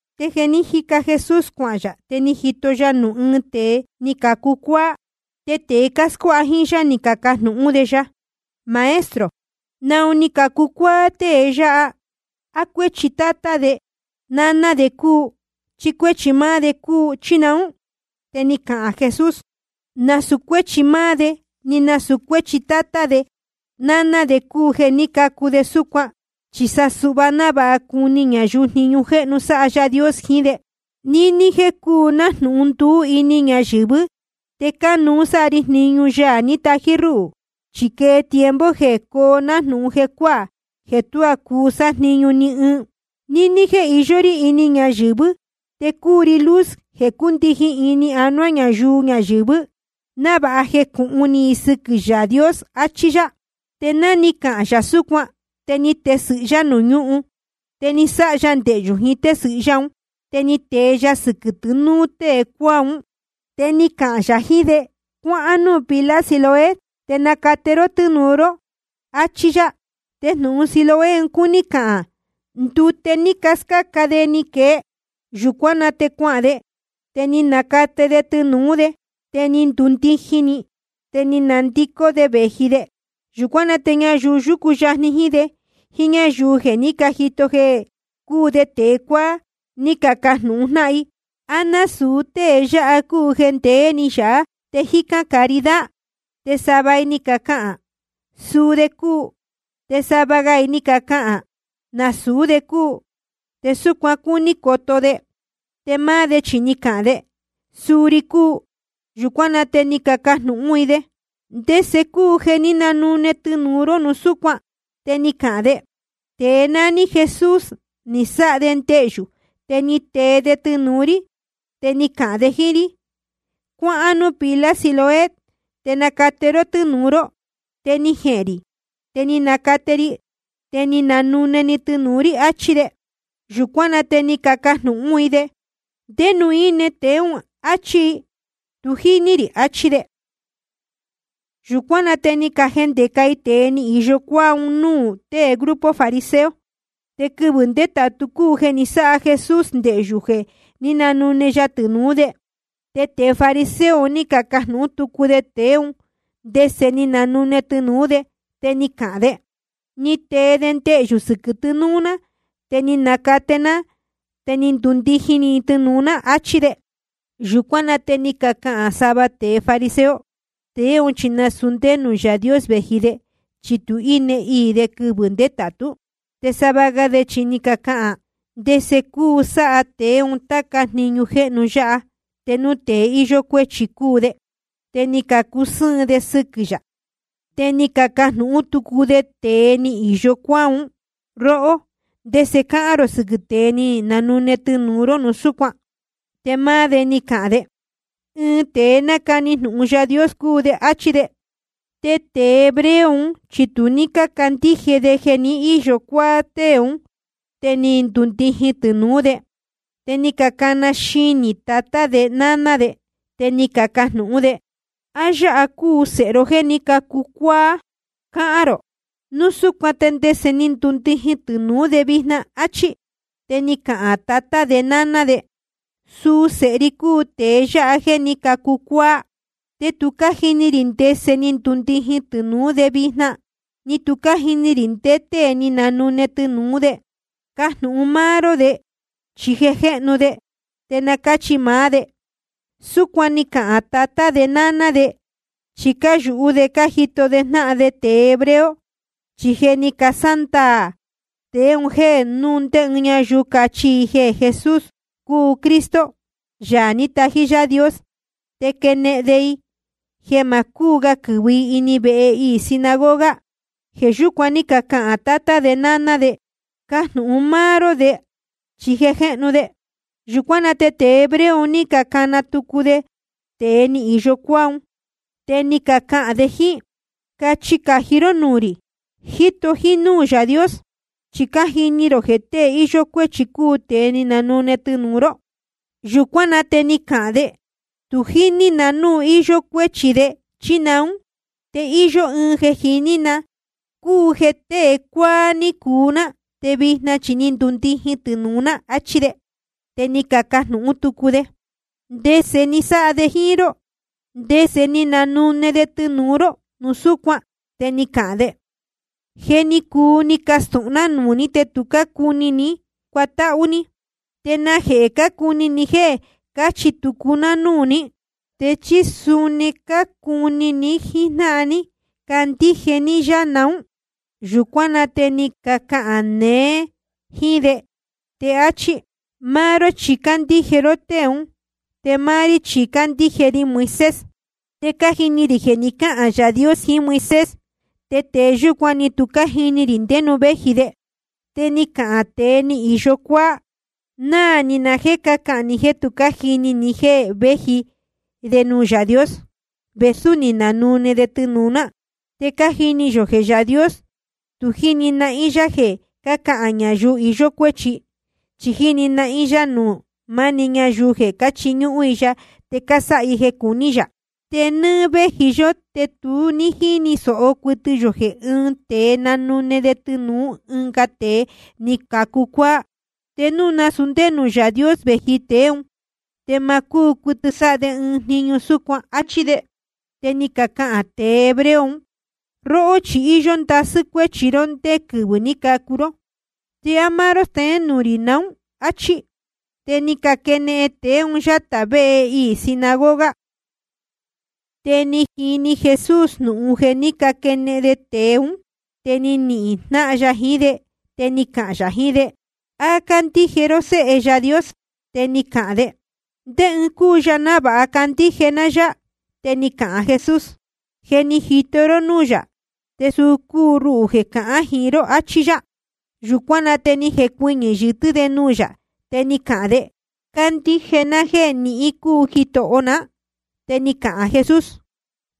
Te jeē jíca Jesús cuahān yā, te ni jito ya nuū ɨɨn tēe ni cacu cuáá. Te tēe cáscuáha jíín yá ni cacajnūhún de ya: Maestro, ¿naun ni cacu cuáá tée yáha? ¿A cuéchi tátá de náná de cúu, chí cuéchi máá de cúu, chí naún? Te ni cahān Jesús: Nasūu cuéchi máá de, ni nasūu cuéchi tátá de náná de cúu jeē ní cacu de súcuan, chi sa suhva návāha cuni ñayuu jniñu jéhnu sáha Yaā Dios jiín de. Níní jéē cúu nájnūhun nduú ini ñayɨ̄vɨ́, te cánuú sáha ri jniñu Yaā ní tají rúhū. Chi quee tiempo jeē coo nájnūhun jecuáā, jeē tuá cuu sájniñu ni ɨɨn. Níní jéē iyó rí ini ñayɨ̄vɨ́ te cúu ri luz jeē cúndijin ini anuá ñayuu ñayɨ̄vɨ́, návāha jecūhun ni i sɨquɨ̄ Yaā Dios. Achí yá. Te ná ni cahān yā súcuan, te ni tesɨ̄hɨ yá nuū ñúhun, te ni sáha ya ndehyū jiín tésɨ̄hɨ yá un, te ni tee ya sɨquɨ̄ tɨ́nūu tée cuáá un. Te ni cahān yā jiín de: Cuáhán núū pila Siloé te nacate ró tɨ́nūu ró, achí yá. Te jnūhun Siloé cuní cahān, ndute ní cascáca de ni quee. Yūcuán na te cuahān de, te ni nacate de tɨnūú de, te ni ndundijin‑ni, te ni nandicó de vēji de. Yūcuán na te ñayuu yúcu yajni jíín de, jíín ñáyuu jeē ní cajito jeē cúu de tēe cuáá, ni cacajnūhun jnáhan i: ¿A násūu tée yáha cúu jeē ndeé-ni yāhá te jícán caridad? Te sava i ni cacahān: Suu de cúu. Te sava ga i ni cacahān: Nasūú de cúu, te súcuan cúní coto de. Te máá de chi ni cahān de: Suu ri cúu. Yūcuán na te ni cacajnūhún i de: ¿Te ndese cúu jeē ní nanune tɨnūu ró núu súcuan? Te ni cahān de: Tēe nání Jesús ni sáha de ndehyū, te ni tee de tɨnūu rí, te ni cahān de jíín rí: Cuáhán núū pila Siloé te nacate ró tɨ́nūu ró. Te ni jehēn rī, te ni nacate ri, te ni nanune‑ni tɨnūu rí, achí de. Yūcuán na te ni cacajnūhún i de: ¿Ndé nuū íne tēe ún? áchí i. Tu jíní rī, achí de. Yūcuán na te ni cajendeca i tēe ni īyo cuáá un núū tée grupo fariseo. Te quɨvɨ̄ ndétātu cúu jeē ni sáha Jesús ndehyū jeē ní nanune ya tɨnūú de. Te tēe fariseo un ní cacajnūhún tucu de tēe ún ndese ni nanune tɨnūú de. Te ni cahān de: Ni tee de ndehyū sɨquɨ̄ tɨnūu ná, te ni nacate ná, te ni ndundijin‑ni tɨnūu ná, achí de. Yūcuán na te ni cacahān sava tēe fariseo: Tēe ún chi nasūu ndé nuū Yaā Dios vēji de, chi tu née iī de quɨvɨ̄ ndétātú. Te sava ga de chi ni cacahān: ¿Ndese cuu sáha tēe un táca jniñu jéhnu yáha te núu tēe íyó cuéchi cúu de? Te ni cacusɨ́ɨn de sɨquɨ̄ yā. Te ni cacajnūhún tucu de tēe ni īyo cuáá un: Róhó, ¿ndese cáhán rō sɨquɨ̄ tée ni nanune tɨnūu ró núu súcuan? Te máá de ni cahān de: Ɨɨn tēe nácani jnūhun Yaā Dios cúu de, áchí de. Te tēe hebreo un chi tu ní cácandíje de jeē ni íyo cuáá tée ún te ni ndundijin tɨnūú de. Te ni cacana xinī tatá de náná de. Te ni cacajnūhún de: ¿A yáha cúu sēhe ro jéē ní cacu cuáá cácahān rō? Núu súcuan ¿te ndese ni ndundijin tɨnūú de vijna? áchí. Te ni cacahān tatá de náná de: Suu sēhe ri cúu tēe yáha jéē ní cacu cuáá. Te tu cájini rī ndese ni ndundijin tɨnūú de vijna, ni tu cájini rī ndé tée ni nanune tɨnūú de. Cajnūhun ró maá de, chi je jéhnu de, te na cáchi máá de. Súcuan ni cacahān tatá de náná de, chi cáyūhú de cájito de jnáhan de tēe hebreo. Chi je ni casándaā tēe un jéē núu ndé ñáyuu cachi i jeē Jesús cúu Cristo, Yaā ní tají Yaā Dios, te quenehen de i jeē ma cúu ga quɨ̄vɨ i ini vehe iī sinagoga. Jeē yúcuan ní cacahān tatá de náná de: Cajnūhun ró maá de, chi je jéhnu de. Yūcuán na te tēe hebreo un ní cacana tucu de tēe ni īyo cuáá un. Te ni cacahān de jíín: Cachi cají ró nuū rī, jíto jínúū Yaā Dios. Chi cájini rī jeē tée íyó cuéchi cúu tēe ni nanune tɨnūu ró. Yūcuán na te ni cahān de: Tu jíní na núu íyó cuéchi de, chí naún. Te íyó ɨɨn jeē jiní ná, cúu jeē tēe cuáá ní cuu ná, te vijna chi ni ndundijin tɨnūu ná. Achí de. Te ni cacajnūhún tucu de: ¿Ndese ni sáha de jíín ró? ¿Ndese ni nanune de tɨnūu ró núu súcuan? Te ni cahān de: Je ni cuu ni castūhun ná nuū ní, te tu ní cácuni ní cuatáhú ní. ¿Te najehē cácuni ni jéē cáchi tucu ná núū ní? ¿Te chí suni cácuni ni jíjnáhan ní candíje ní yá naún? Yūcuán na te ni cacahān neé jíín de, te áchí: Máá ró chi cándíje ró tée ún, te máá rí chi cácandíje ri Moisés. Te cájini rī jeē ni cáhān Yaā Dios jiín Moisés. Te tēe yúcuan, ni tu cájini rī ndé nuū véji de. Te ni cahān tēe ni īyo cuáá: Náā ni na jéē cácahān ni jéē tu cájini ní jeē véji de nuū Yaā Dios, vēsú ni nanune de tɨnūu ná. Te cájini yō jeē Yaā Dios tu jíni nahín yá jeē cájicān ñayuu iyó cuéchi. Chi jíni nahín yá nuū maá‑ni ñayuu jeē cáchiñúhún i ya te cásáha i jeē cuní yā. Te nɨ́ɨ́ véji yó te tu ní jíni sōho cuɨtɨ yō jeē ɨ́ɨn tēe nanune de tɨnūú ɨnga tēe ni cacu cuáá. Te núu nasūu ndé nuū Yaā Dios vēji tēe ún, te ma cúu cuɨtɨ sáha de ɨɨn jniñu súcuan. Achí de. Te ni cacahān tēe hebreo un: Róhó chi íyó ndasɨ́ cuéchi ró ndé quɨvɨ̄ ní cacu ró, ¿te á máá ró steén nuū rī naún? áchí. Te ni caquenehen tēe un yátā vehe iī sinagoga. Te ni jini jnūhun Jesús jeē ní caquenehen de tēe ún. Te ni nihīn jnáhan ya jiín de, te ni cahān yā jiín de: ¿A cándíje ró Séhe Yaā Dios? Te ni cahān de: ¿Ndé ɨɨn cúu ya návāha candíje ná yá? Te ni cahān Jesús: Je ni jito ró núū yā, te suu cúu ruhū jeē cahán jiín ró, achí yá. Yūcuán na te ni jecuɨñɨ̄ yɨtɨ́ de nuū yā, te ni cahān de: Cándíje ná jéē nihín cúu Jitoho ná. Te ni cahān Jesús: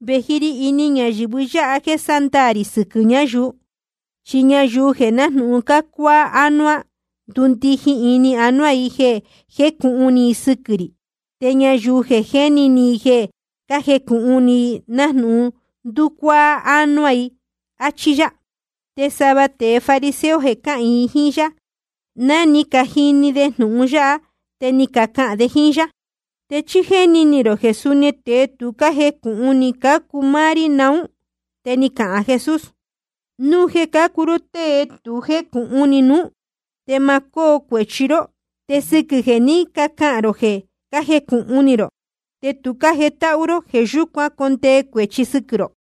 Vēji ri ini ñayɨ̄vɨ yáha jéē sándaā rī sɨquɨ̄ ñáyuu. Chi ñayuu jeē nájnūhun cácuáá ánuá, ndundijin ini anuá i jeē jécūhun ni i sɨquɨ̄ rī. Te ñayuu jeē jéni ni i jeē cájecūhun ni i, nájnūhun nducuáá ánuá i. Achí yá. Te sava tēe fariseo jeē cáhīin jiín yá, ná ni cajini de jnūhun yáha, te ni cacahān de jíín yá: ¿Te chí jéni ni rō jeē suni tēe tu cájecūhun ni cácuu máá rí naún? Te ni cahān Jesús: Núu jeē cácuu ró tée tu jécūhun ni nuú, te ma cóo cuēchi ró. Te sɨquɨ̄ jeē ní cacahān rō jeē cájecūhun ni rō, te tu cájetáhú ró, jeē yúcuan condee cuēchi sɨquɨ̄ rō.